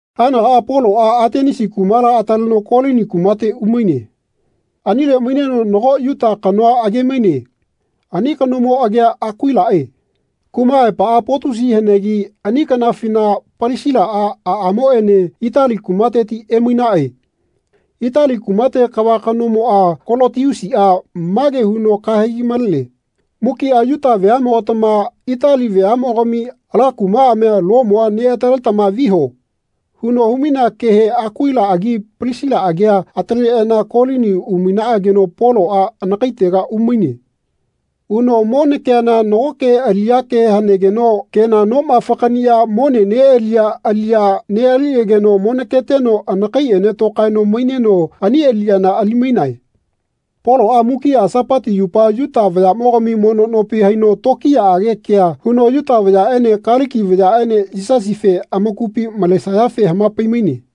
Haenagaꞌa Poloꞌa Atenisi kumala ataleno Kolini kumate umaine. Anile maineno nago Yuta kanoa age-maine. Ani kanomo agia Akuilaꞌe. Kuma aepaꞌa Potusi hanegi ani kanafina Palisilaꞌa aꞌamoꞌene Itali kumateti emainaꞌe. Itali kumate kava kanomoꞌa Kolotiusiꞌa mage huno kahegi malene “Mukiꞌa Yuta veaꞌmogatama Itali veaꞌmogami ala kumaꞌamia, Lomua, neꞌataletama viho.” huno humainea kehe Akuilaꞌagi Palisilaꞌagia ataleꞌana Kolini umainaꞌageno Poloꞌa anakaitega umaine. Uno monakeana nagoke aliꞌyake hanegeno kena noma fakaꞌniꞌya mone neꞌaliya aliꞌya neꞌaliꞌageno monaketeno anakaiꞌene tokaeno maineno ani aliꞌyana ali-mainae. Poloꞌa mukiꞌa Sapati yupa Yuta vayaꞌmogami mono nopi haino tokiyaꞌage kea huno Yuta vayaꞌene Kaliki vayaꞌene Yisasife amakupi malesayafe hamapai-maine.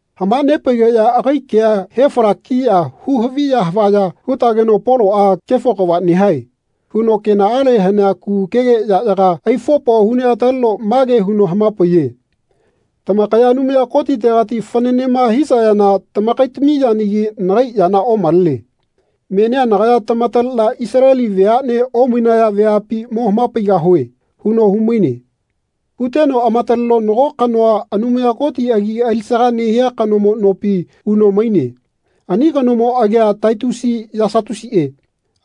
Hamanepaigeꞌya agai kea hefalakiꞌya hu-haviya havaya hutageno Poloꞌa “Kefo kava nehae.” huno kenaꞌale hanea kugukege yaꞌyaga aifopo huneꞌataleno mage huno hamapaiye “Tamakaya Anumaya Kotitegati fananema hisayana tamakaitami yanagi nagai yana omalene. Menia nagaya tamataleꞌna Isaleli veaꞌne omainaya veapi mo hamapaigahue.” huno humaine. Huteno amataleno nago kanoa Anumaya Koti agi alisaga nehia kanomo nopi uno maine. Ani kanomo agia Titiusi Yasatusiꞌe.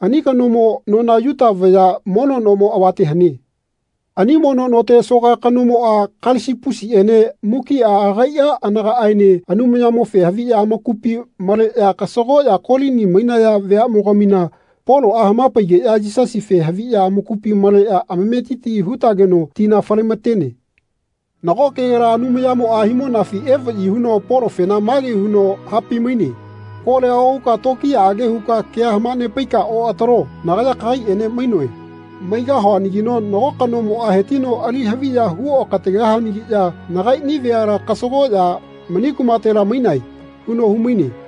Ani kanomo nona Yuta vaya mono nomo avate hane. Ani mono note soka kanomoꞌa Kalisipusiꞌene mukiꞌa agaiꞌa anagaꞌaene Anumayamofe haviꞌya amakupi malageꞌya kasagoꞌya Kolini mainaya veaꞌmogamina Poloꞌa hamapaigeꞌya Yisasife haviꞌya amakupi maleꞌya amametiti hutageno tina fale-matene. Nago kegela Anumayamoꞌa himonafi evaꞌyi huno Polofena mage huno hapaimaine “Kolia ohuka tokiyaꞌage huka kea hamanepaika oꞌatalo. Nagaya kagaiꞌene mainoe. Maigahuanagino nago kanomoꞌa hetino ali haviya huokategahayanagiꞌya nagaiꞌni veala kasagoꞌya mani kumatela mainae.” huno humaine.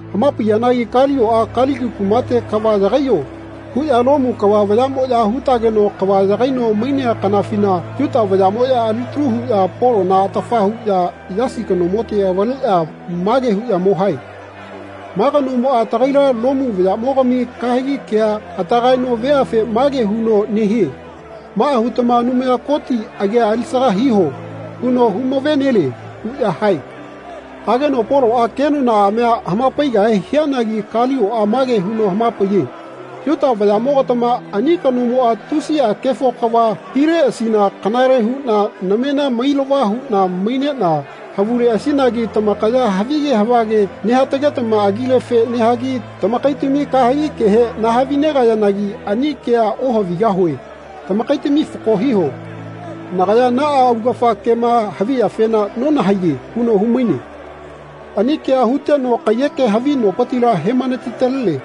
Hamapaiyanagi Kalioꞌa “Kaliki kumate kava yagaiyo.” huꞌya Lomu kava vayaꞌmoꞌya hutageno kava yagaino mainea kanafina Yuta vayaꞌmoꞌya alitalu huꞌya Polona atafa huꞌya Yasi kanomote avaleꞌya mage huꞌya mo hae “Ma kanomoꞌa tagaila Lomu vayaꞌmogami kahegi kea atagaeno veafe mage huno nehie ‘Maꞌa hutama Anumaya Koti agia alisaga hiho.’ huno humave-nelie.” huꞌya hae. Hageno Poloꞌa kenonaꞌamia hamapaigahe hianagi Kalioꞌa mage huno hamapaiye “Yuta vayaꞌmogatama ani kanomoꞌa tusiꞌa kefo kava hileꞌasina kanale huꞌna namena mailava huꞌna maineꞌna havuleꞌasinagi tamakaya havige havage nehatagetama agilefe nehagi tamakaitami kahegi kehe nahavinegayanagi ani kea ohavigahue tamakaitami fako hiho. Nagaya naꞌa augafa kema haviyafena nonahaiye” huno humaine. Ani kea huteno kaiyeke havi nopitila hemanati-talene.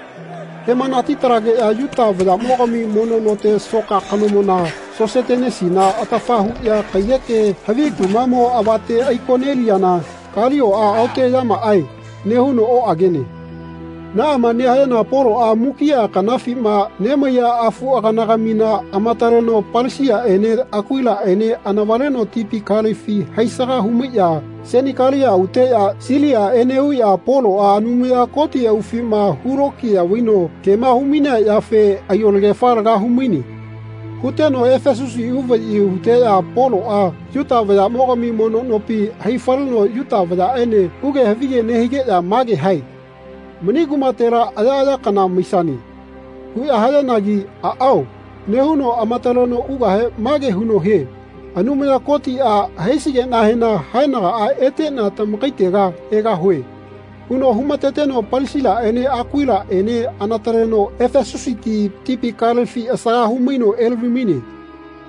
Hemanati-talegeꞌya Yuta vayaꞌmogami mono note soka kanomona Sosetenesina atafa huꞌya kaiyeke havi kumaꞌmo avate aiko-neliyana Kalioꞌa “Aoteꞌyamaꞌae.” nehuno oꞌagene. Naꞌama nehayana Poloꞌa mukiꞌa kanafima nemaiya afuꞌaganagamina amataleno Palisilaꞌene Akuilaꞌene anavaleno tipi kalefi haisaga humaiꞌya Senikalia uteꞌya Silia eneꞌuꞌya Poloꞌa Anumaya Koti aufima hulokiya vaino kema humainea yafe aiyolagefa laga humaine. Huteno Efesusi uvaꞌyi huteꞌya Poloꞌa Yuta vayaꞌmogami mono nopi hai-faleno Yuta vayaꞌene huge havige nehigeꞌya mage hae “Mani kumatela ayaꞌaya kana maisane.” huꞌya hayanagi “Aꞌao.” nehuno amataleno ugahe mage huno hie “Anumaya Kotiꞌa haisigeꞌnahena haenagaꞌa eteꞌna tamakaitega egahue.” huno humateteno Palisilaꞌene Akuilaꞌene neꞌanataleno Efesusiti tipi kalefi asaga humaino elavi-maine.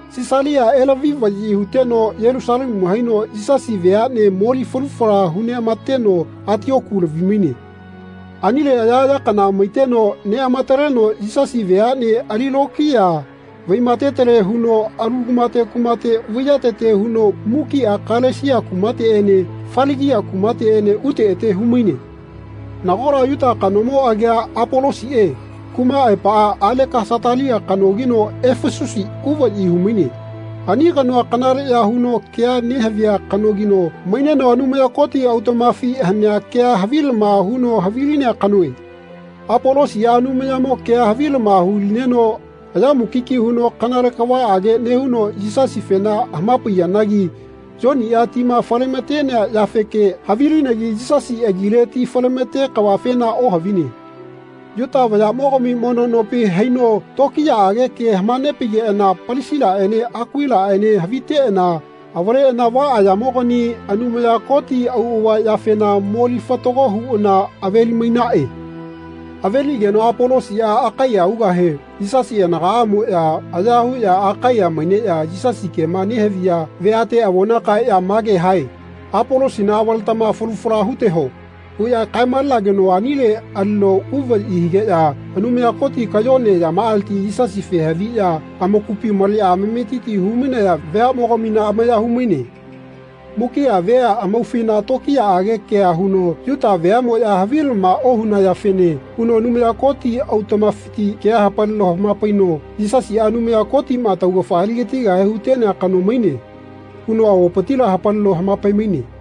Sisalia elavi-vaꞌyi huteno Yelusalemu haino Yisasi veaꞌne moli falu fala huneꞌamateno Atioku lavi-maine. Anile ayaꞌaya kana maiteno neꞌamataleno Yisasi veaꞌne ali lokiya vaimatetele huno alu kumate kumate vaiyatete huno mukiꞌa Kalesia kumateꞌene Faligia kumateꞌene ute ete humaine. Nagola Yuta kanomo agia Apolosiꞌe kuma aepaꞌa Alekasatalia kanogino Efesusi uvaꞌyi humaine. Ani kanoa kanaleꞌya huno kea nehavia kanogino maineno Anumaya Koti autaꞌmafi hanea kea havilama huno havilinea kanoe. Apolosiꞌa Anumayamo kea havilama hulineno aya mukiki huno kanale kavaꞌage nehuno Yisasifena hamapaiyanagi Yoniꞌa tima falematenea yafeke havilinegi Yisasi agile ti falemate kavafena ohavine. Yuta vayaꞌmogami mono nopi haino tokiyaꞌage kea hamapaigeꞌana Palisilaꞌene Akuilaꞌene haviteꞌana avaleꞌana vaꞌaꞌyamogani Anumaya Koti auꞌava yafena moli fatago huꞌana aveli-mainaꞌe. Aveliꞌageno Apolosiꞌa Akaiya ugahe Yisasi anagaꞌamoꞌya aya huꞌya Akaiya maineꞌya Yisasi kema nehaviya veate avona kaeꞌya mage hae “Apolosina avaletama falu fala huteho.” huꞌya kae-malageno anile alino uvaꞌyi higeꞌya Anumaya Koti kayone yamaꞌaleti Yisasife haviꞌya amakupi maleꞌya amametiti humainaya veaꞌmogamina amaya humaine. Mukiꞌa vea amaufina tokiyaꞌage kea huno Yuta veaꞌmoꞌya havilama ohunayafene huno Anumaya Koti autaꞌmafiti kea hapalino hamapaino “Yisasiꞌa Anumaya Kotiꞌma taugafa aligatigahe hutenea kano maine.” huno avopitila hapalino hamapaimaine.